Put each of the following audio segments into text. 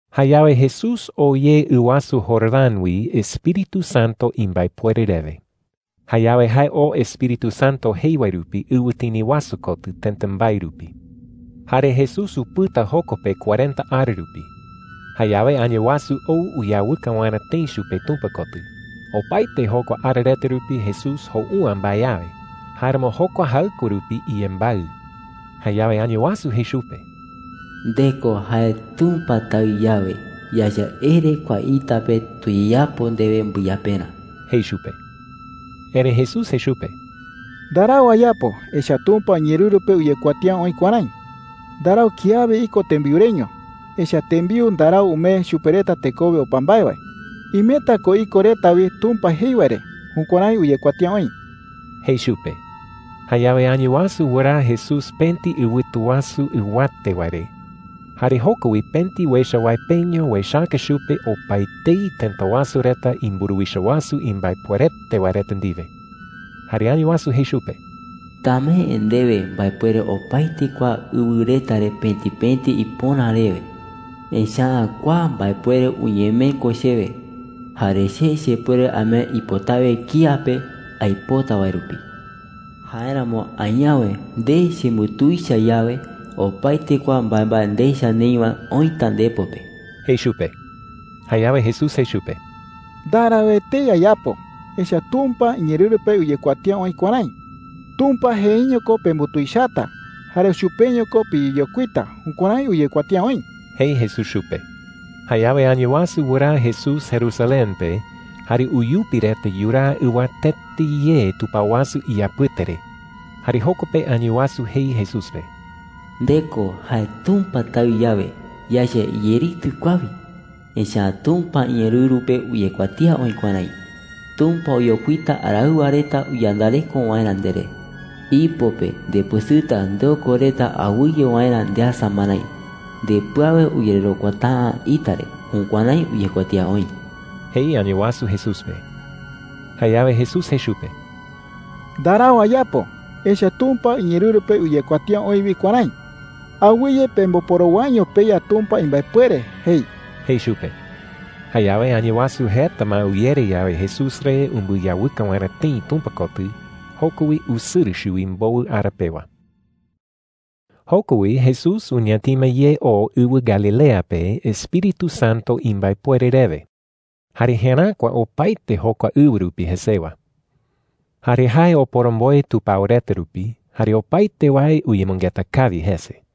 Jayawe Jesús ou ye ɨ wasu Jordán wi Espíritu Santo imbaepuere rewe. Jayawe jae oo Espíritu Santo jei wae rupi ɨwɨtini wasu kotɨ tëta mbae rupi. Jare Jesús upɨta joko pe cuarenta ara rupi. Jayawe Añawasu ou uyawɨka waerä tëi chupe Tumpa kotɨ. Opaete jokua ara reta rupi Jesús jou’ä mbae awe. Jáeramo jokua jaɨkue rupi iyembaɨ. Jayawe Añawasu jei chupe: “Nde ko jae Tumpa Taɨ yawe, yaecha ere kua ita pe tuyeyapo ndewe mbɨyaperä,” jei chupe. Erëi Jesús jei chupe: “Ndarau ayapo. Echa’ä Tumpa iñeerɨru pe uyekuatía oï kuärái: ‘Ndarau kiawe iko tembiu reño. Echa’ä tembiu ndarau umee chupe reta tekowe opa mbae wae. Imeta ko iko reta wi Tumpa jei wae re.’ Jukuärái uyekuatía oï,” jei chupe. Jayawe Añawasu wɨraa Jesús pëti ɨwɨtu wasu ɨwate wae re, jare joko wi pëti uecha wae peño uechaka chupe opaetei tëta wasu reta imburuwicha wasu imbaepuerete wae reta ndiwe. Jare Añawasu jei chupe: “Tamee ndewe mbaepuere opaete kua ɨwɨ reta re pëti pëti ipöra rewe. Echa’ä kua mbaepuere uñemee ko chewe, jare che chepuere amee ipotawe kía pe aipota wae rupi,” jei chupe. “Jáeramo añawe nde chembutuicha yawe, opaete kua mbaembae ndecha neï wae oïta ndepo pe,” jei chupe. Jayawe Jesús jei chupe: “Ndarau etei ayapo. Echa’ä Tumpa iñeerɨru pe uyekuatía oï kuärái: ‘Tumpa jeeño ko pembutuichata, jare chupeño ko piyeyokuita.’ Jukuärái uyekuatía oï,” jei Jesús chupe. Jayawe Añawasu wɨraa Jesús Jerusalén pe, jare uyupi reta yuraa ɨwatete ye tupao wasu iyapɨte re. Jare joko pe Añawasu jei Jesús pe: “Nde ko jae Tumpa Taɨ yawe, yaecha iyeritɨ kua wi. Echa’ä Tumpa iñeerɨru pe uyekuatía oï kuärái: ‘Tumpa oyokuita araɨwa reta uyandareko waerä nderé. Ipo pe ndepɨsɨta ndeoko reta awɨye waerä ndeasa marái. Ndepɨ awe uyererokuata’ä ita re.’ Jukuärái uyekuatía oï,” jei Añawasu Jesús pe. Jayawe Jesús jei chupe: “Ndarau ayapo. Echa’ä Tumpa iñeerɨru pe uyekuatía oï wi kuärái: ‘Awɨye pemboporowaiño peYa Tumpa imbaepuere,’ jei,” jei chupe. Jayawe Añawasu jeta ma uyere yawe Jesús re umbɨyawɨka waerä tëi Tumpa kotɨ, joko wi usɨrɨ chuwi mbowɨ ara pewa. Joko wi Jesús uñatima ye oo ɨwɨ Galilea pe Espíritu Santo imbaepuere rewe. Jare jeräkua opaete jokua ɨwɨ rupi jesewa. Jare jae oporomboe tupao reta rupi, jare opaete wae uyemɨngeta kawi jese.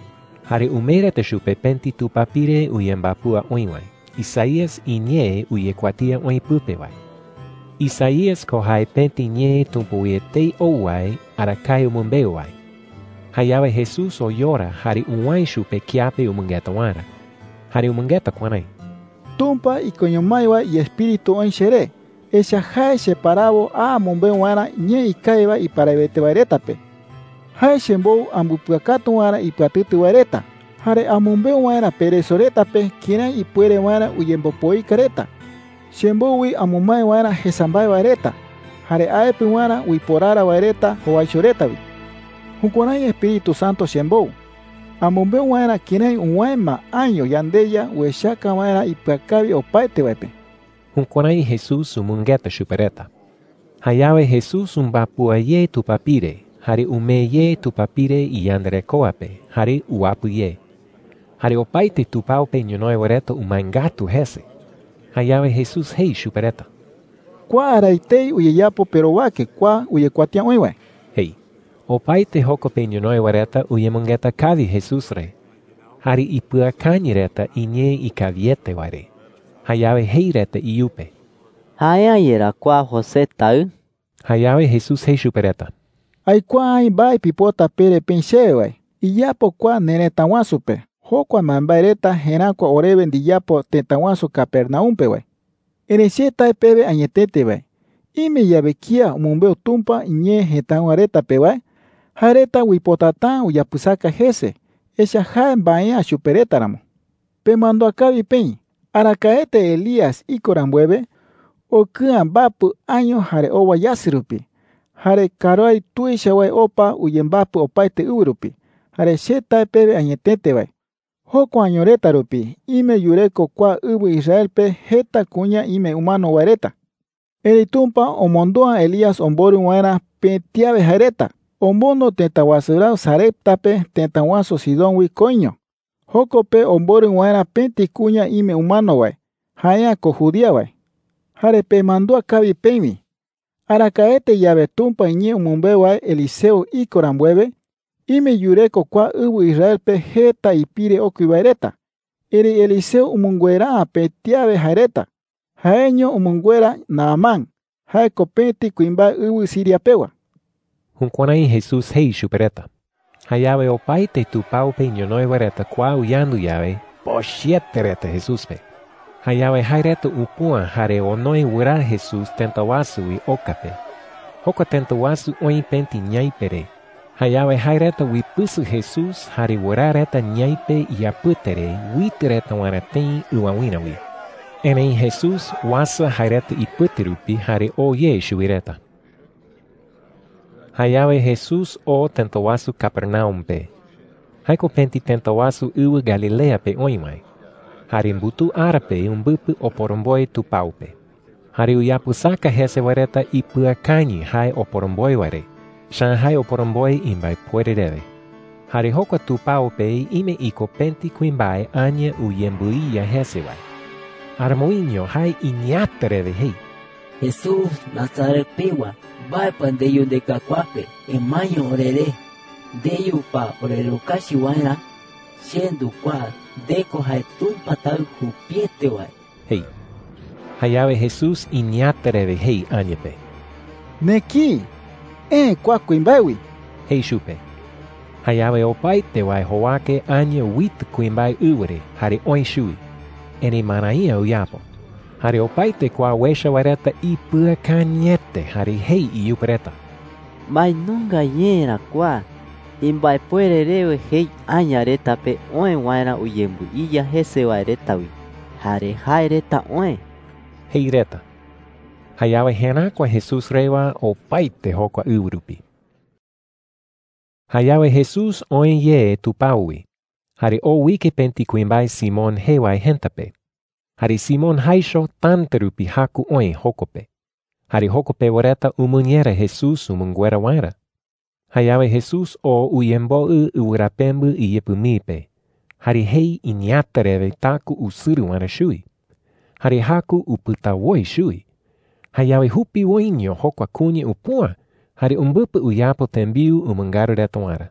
Jare umee reta chupe pëti tupapire uyembapúa oï wae, Isaías iñee uyekuatía oï pɨpe wae. Isaías ko jae pëti ñee Tumpa wi etei ou wae arakae umɨmbeu wae. Jayawe Jesús oyora jare uwäe chupe kiape umɨngeta waerä. Jare umɨngeta kuärái: “Tumpa ikoño mái wae iEspíritu oï cheré, echa’ä jae cheparawo a amɨmbeu waerä ñee ikawi wae iparawete wae reta pe. Jae chembou ambɨpɨakatu waerä ipɨatɨtɨ wae reta, jare amɨmbeu waerä pereso reta pe kërái ipuere waerä uyembopoika reta. Chembou wi amɨmae waerä jesa mbae wae reta, jare aepɨ waerä uiporara wae reta jowaicho reta wi. Jukuärái Espíritu Santo chembou amɨmbeu waerä kërái uwäe ma año yandeYa uechaka waerä ipɨakawi opaete wae pe.” Jukuärái Jesús umɨngeta chupe reta. Jayawe Jesús umbapúa ye tupapire, jare umee ye tupapire iyandarekoa pe, jare uwapɨ ye. Jare opaete tupao pe ñonoï wae reta umae ngatu jese. Jayawe Jesús jei chupe reta: “Kua ara etei uyeyapo perowake kua uyekuatía oï wae,” jei. Opaete joko pe ñonoï wae reta uyemɨngeta kawi Jesús re, jare ipɨakañɨ reta iñee ikawiete wae re. Jayawe jei reta iyupe: “¿Jae’ä yerá kua José taɨ?” Jayawe Jesús jei chupe reta: “Aikuaa aï mbae pipota pere peï chewe wae: ‘Iyapo kua nerëta wasu pe jokua mbaembae reta jeräkua orewe ndiyapo tëta wasu Capernaum pe wae.’ Erëi che tae pewe añetete wae, ime yawe kía umɨmbeu Tumpa iñee jëtáɨwa reta pe wae, jae reta uipotata’ä uyapɨsaka jese, echa’ä jae mbae’ä chupe reta ramo,” jei chupe reta. “Pemandúa kawi peï, arakaete Elías iko rambuewe, okɨ'ä mbapɨ año jare owa yasɨ rupi, jare karuái tuicha wae opa uyembapɨ opaete ɨwɨ rupi. Jare che tae pewe añetete wae, jokua año reta rupi ime yureko kua ɨwɨ Israel pe jeta kuña ime umano wae reta. Erëi Tumpa omondo’ä Elías omborɨ waerä pëti awe jae reta. Omondo tëta wasu raɨ Sarepta pe tëta wasu Sidón wi koiño, joko pe omborɨ waerä pëti kuña ime umano wae, jae’ä ko judía wae,” jei chupe reta. “Jare pemandúa kawi peï wi, arakaete yawe Tumpa iñee umɨmbeu wae Eliseo iko rambuewe, ime yureko kua ɨwɨ Israel pe jeta ipire okui wae reta. Erëi Eliseo umɨnguera’ä pëti awe jae reta. Jaeño umɨnguera Naamán – jae ko pëti kuimbae ɨwɨ Siria pewa.” Jukuärái Jesús jei chupe reta. Jayawe opaete tupao pe ñonoï wae reta kua uyandu yawe, pochɨete reta Jesús pe. Jayawe jae reta upüa jare onoe wɨraa Jesús tëta wasu wi oka pe. Jokua tëta wasu oï pëti ñaipe re. Jayawe jae reta uipɨsɨ Jesús jare wɨraa reta ñaipe iyapɨte re uitɨ reta waerä tëi ɨwawïra wi. Erëi Jesús uasa jae reta ipɨte rupi jare oo ye chuwi reta. Jayawe Jesús oo tëta wasu Capernaum pe. Jae ko pëti tëta wasu ɨwɨ Galilea pe oï wae. Jare mbutuu ara pe umbɨpɨ oporomboe tupao pe. Jare uyapɨsaka jese wae reta ipɨakañɨ jae oporomboe wae re, echa’ä jae oporomboe imbaepuere rewe. Jare jokua tupao pe ime iko pëti kuimbae aña uyembɨiya jese wae. Aramoiño jae iñeeäta rewe jei: “Jesús Nazaret pewa, ¿mbae pa ndeyu ndeka kua pe? ¡Emaeño oreré!” jei. “¿Ndeyu pa orerukachi waerä? Che ndukuaa. Nde ko jae Tumpa Taɨ jupiete wae,” jei. Jayawe Jesús iñeeäta rewe jei aña pe: “¡Nekïi! Eë kua kuimbae wi,” jei chupe. Jayawe opaete wae jowake aña uitɨ kuimbae ɨwɨ re jare oë chuwi. Erëi marai’ä uyapo. Jare opaete kua uecha wae reta ipɨakañɨete, jare jei iyupe reta: “¿Mbae nunga ñee ra kua? Imbaepuere rewe jei aña reta pe oë waerä uyembɨiya jese wae reta wi. ¡Jare jae reta oë!” jei reta. Jayawe jeräkua Jesús rewa opaete jokua ɨwɨ rupi. Jayawe Jesús oë ye tupao wi, jare oo uike pëti kuimbae Simón jee wae jëta pe. Jare Simón jaicho täta rupi jaku oï joko pe. Jare joko pewa reta umɨñera Jesús umɨnguera waerä. Jayawe Jesús oo uyemboɨ wɨrapembɨ iyɨpɨ mii pe, jare jei iñeeäta rewe taku usɨrɨ waerä chuwi. Jare jaku upɨta woi chuwi. Jayawe jupiwoiño jokua kuña upüa jare umbɨpɨ uyapo tembiu umɨngaru reta waerä.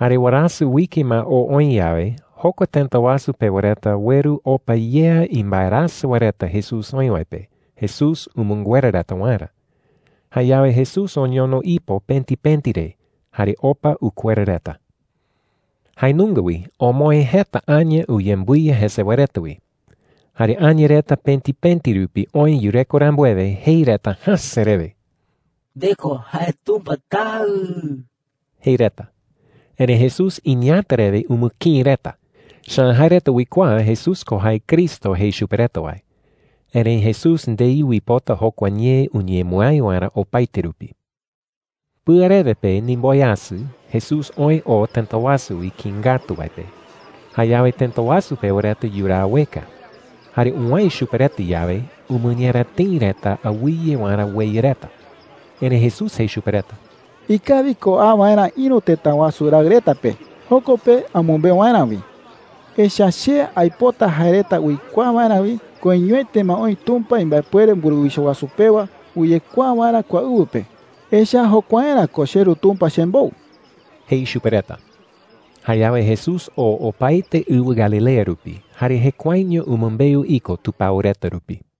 Jare warasɨ uike ma oo oï yawe, jokua tëta wasu pewa reta ueru opa yea imbaerasɨ wae reta Jesús oï wae pe Jesús umɨnguera reta waerä. Jayawe Jesús oñono ipo pëti pëti re, jare opa ukuera reta. Jae nunga wi omoë jeta aña uyembɨiya jese wae reta wi. Jare aña reta pëti pëti rupi oë yureko rambuewe, jei reta jäse rewe: “Nde ko jae Tumpa Taɨ,” jei reta. Erëi Jesús iñeeäta rewe umɨkïi reta. Echa’ä jae reta uikuaa Jesús ko jae Cristo jei chupe reta wae. Erëi Jesús ndei uipota jokua ñee uñemɨái waerä opaete rupi. Pɨarewe pe ndimboweasɨ, Jesús oë oo tëta wasu wi kïi ngatu wae pe. Jayawe tëta wasu pewa reta yuraa ueka. Jare uwäe chupe reta yawe, umɨñera tëi reta awɨye waerä ueya reta. Erëi Jesús jei chupe reta: “Ikawi ko a waerä ïru tëta wasu raɨ reta pe, joko pe amɨmbeu waerä wi. Echa’ä che aipota jae reta uikuaa waerä wi koiñoete ma oï Tumpa imbaepuere mburuwicha wasu pewa uyekuaa waerä kua ɨwɨ pe. Echa’ä jokuaerä ko cheRu Tumpa chembou,” jei chupe reta. Jayawe Jesús oo opaete ɨwɨ Galilea rupi, jare jekuaeño umɨmbeu iko tupao reta rupi.